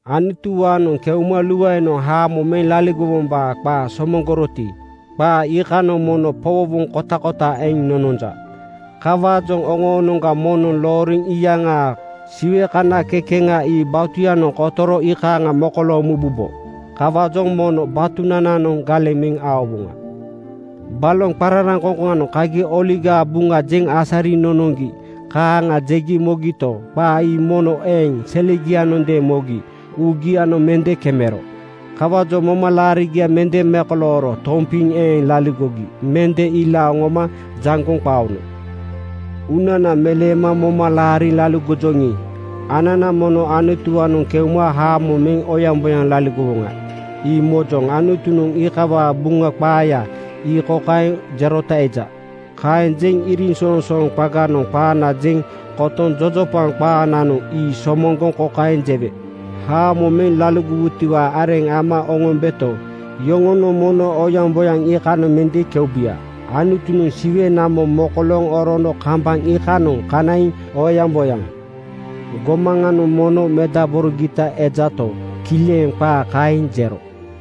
Anutuwaanoŋ keuma luaenoŋ haamo meŋ laligowombaa qaa somoŋgoroti, qaa iikanoŋ mono powowoŋ kotakota eŋ nononja. Kawaajoŋ oŋoonoŋga moŋnoŋ looriŋ iyaŋaa Siwe kana kekeŋa ii batuyanoŋ kotoro iikaaŋa mokolooŋ mubombo. Kawaajoŋ mono batunananoŋ galeŋ meŋ aowoŋa. Baloŋ qararaŋkoŋkoŋanoŋ kagi Oligaa Buŋa jeŋ asariŋ nonoŋgi kaaŋa jegi mogito, qaa ii mono eeŋ selegianondeeŋ mogi uugianoŋ mende kemero. Kawaajoŋ moma-laarigia mende mekolooro tompiŋ eeŋ laligogi mende ilaaŋ oŋoma jaŋgoŋ qaono. Uunana meleema moma laariŋ laligojoŋi, anana mono Anutuwaanoŋ keuma haamo meŋ oyaŋboyaŋ laligowoŋa, ii mojoŋ. Anutunoŋ iikawaa Buŋa qaaya ii kokaeŋ jerota eja, “Kaeŋ jeŋ iriŋsoŋsooŋ qaganoŋ qaana jeŋ kotoŋ jojopaŋ qaananoŋ ii somoŋgoŋ kokaeŋ jewe, ‘Haamo meŋ laligowutiwaa areŋ ama oŋombeto, yoŋonoŋ mono oyaŋboyaŋ iikanoŋ mende keubuya.’” Anutunoŋ Siwe namo mokolooŋ orono kambaŋ iikanoŋa kanaiŋ oyaŋboyaŋ gomaŋanoŋ mono medaborogita ejato, kileŋ qaa kaeŋ jero.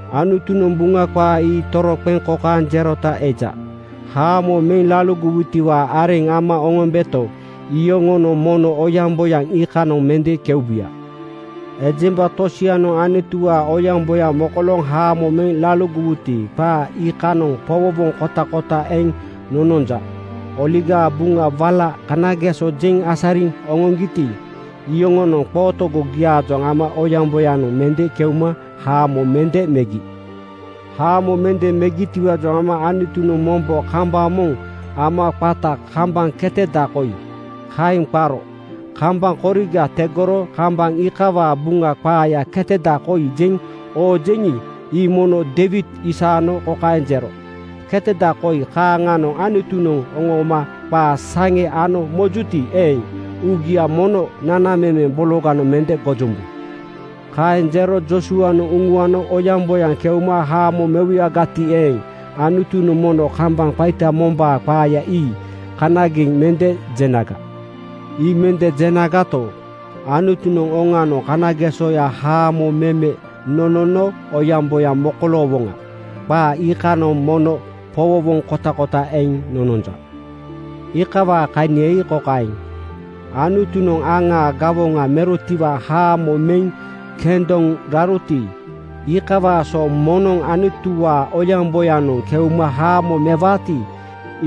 Anutunoŋ Buŋa qaa ii toroqeŋ kokaeŋ jerota eja, “Haamo meŋ laligowutiwaa areŋ ama oŋombeto, yoŋonoŋ mono oyaŋboyaŋ iikanoŋ mende keubuya.” Ejemba tosianoŋ Anutuwaa oyaŋboyaŋ mokolooŋ haamo meŋ laligowuti, qaa iikanoŋ powowoŋ kotakota eŋ nononja. Oligaa Buŋa wala kanageso jeŋ asariŋ oŋoŋgiti, iyoŋonoŋ qootogogiaajoŋ ama oyaŋboyanoŋ mende keuma haamo mende megi. Haamo mende megitiwaajoŋ ama Anutunoŋ mombo kambaŋ moŋ ama qata ‘Kambaŋ keteda koi,’ kaeŋ qaro. Kambaŋ koriga tegoro kambaŋ iikawaa Buŋa qaaya keteda koi jeŋ oojeŋi, ii mono Deiwid isaano kokaeŋ jero, “Ketada koi kaaŋanoŋ Anutunoŋ oŋooma qaa saŋe ano mojuti eeŋ, uugia mono nanamemeŋ bologanoŋ mende gojombu.” Kaeŋ jero Joosuanoŋ uŋuano oyaŋboyanoŋ keuma haamo mewuyagati eeŋ, Anutunoŋ mono kambaŋ qaita mombaa qaaya ii kanageŋ mende jenaga. Ii mende jenagato, Anutunoŋ oŋanoŋ kanagesoya haamo meme nonono oyaŋboyaŋ mokoloowoŋa. Qaa iikanoŋ mono powowoŋ kotakota eŋ nononja. Iikawaa kania ii kokaeŋ: Anutunoŋ aŋaa gawoŋa merotiwaa haamo meŋ kendoŋ raroti, iikawaa so moŋnoŋ Anutuwaa oyaŋboyanoŋ keuma haamo mewaati,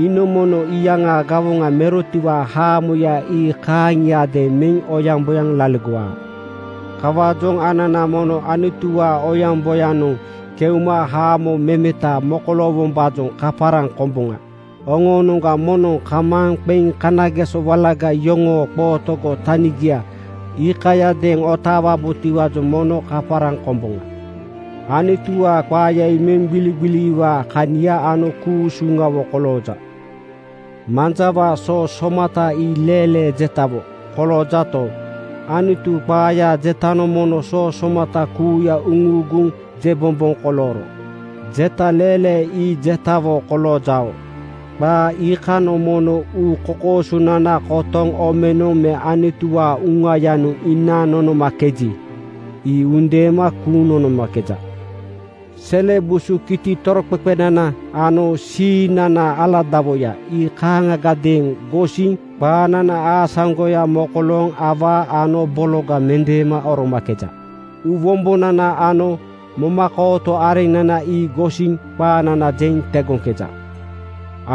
iinoŋ mono iyaŋaa gawoŋa merotiwaa haamoya ii kaaŋiadeeŋ meŋ oyaŋboyaŋ laligowaa. Kawaajoŋ anana mono Anutuwaa oyaŋboyanoŋ keuma haamo memeta mokoloowombaajoŋ kaparaŋ komboŋa. Oŋoonoŋga moŋnoŋ kamaaŋ qeŋ kanageso walaga yoŋoo qootogo tanigia iikayadeeŋ otaawabotiwaajoŋ mono kaparaŋ komboŋa. Anutuwaa qaaya ii meŋgbiligbiliwaa kania ano ku-usuŋawo kolooja. Manjawaa soo somata ii leelee jetawo koloojato, Anutu qaayaa jetanoŋ mono soo somata kuuya uŋuuguŋ jebomboŋ kolooro jeta leelee ii jetawo koloojao. Qaa iikanoŋ mono uu kokoosonana kotoŋ omenoŋ me Anutuwaa Uŋayanoŋ inaaŋ nonomakeji, ii undeema kuuŋ nonomakeja. Sele busu kiti toroqeqenana ano siiŋnanaa aladawoya ii kaaŋagadeeŋ gosiŋ (qaanana aasaŋgoya mokolooŋ) awaa ano bologa mendeema oromakeja. Uuwombonana ano momakooto areŋnana ii gosiŋ qaanana jeŋ tegoŋkeja.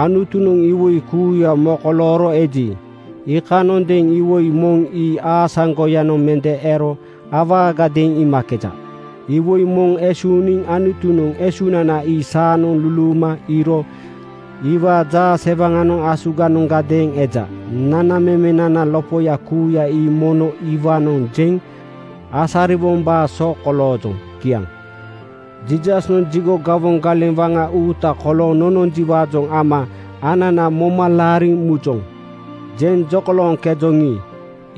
Anutunoŋ iwoi kuuya mokolooro eji, iikanondeeŋ iwoi moŋ ii aasaŋgoyanoŋ mende ero awaagadeeŋ iimakeja. Iwoi moŋ esuuniŋ Anutunoŋ esunana ii saanoŋ luluuma iiro iwaa jaasewaŋanoŋ asuganoŋgadeeŋ eja. Nanamemenanaa lopoya kuuya ii mono iwaanoŋ jeŋ asariwombaa so koloojoŋ. Kiaŋ. Jiisasnoŋ jigo gawoŋ galeŋ waŋa uuta kolooŋ nononjiwaajoŋ ama anana “Moma laariŋ mujoŋ,” jeŋ jokolooŋkejoŋi,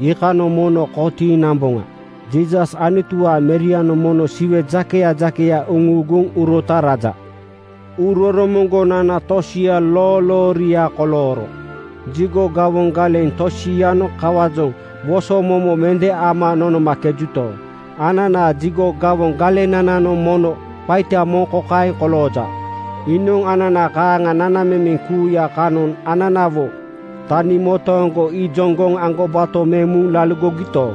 iikanoŋ mono kotiiŋ namboŋa. Jiisas Anutuwaa Merianoŋ mono Siwe jakeya jakeya uŋuuguŋ urota raja. Uuroromoŋgonana tosia loolooria kolooro jigo gawoŋ galeŋ tosianoŋ kawaajoŋ wosomomo mende ama nonomakejuto, ananaa jigo gawoŋ galenananoŋ mono qaita moŋ kokaeŋ kolooja: Iinoŋ anana kaaŋa nanamemeŋ kuuya kanoŋ ananawo tani motooŋgo ijoŋgoŋ aŋgobato meŋ muŋ laligogito,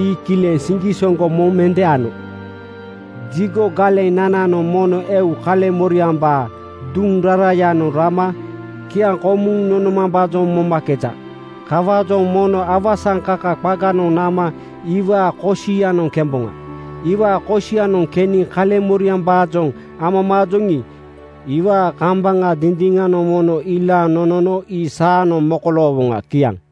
ii kileŋ siŋgisoŋgo moŋ mende ano. Jigo galenananoŋ mono eu kaleŋmoriambaa duŋ rarayanoŋ rama kiaŋkomuŋ nonomambaajoŋ momakeja. Kawaajoŋ mono awasaŋkaka qaganoŋ nama iwaa kosianoŋ kemboŋa. Iwaa kosianoŋ keniŋ kaleŋmoriambaajoŋ amamaajoŋi, iwaa kambaŋa dindiŋanoŋ mono ilaaŋ nonono ii saanoŋ mokoloowoŋa. Kiaŋ.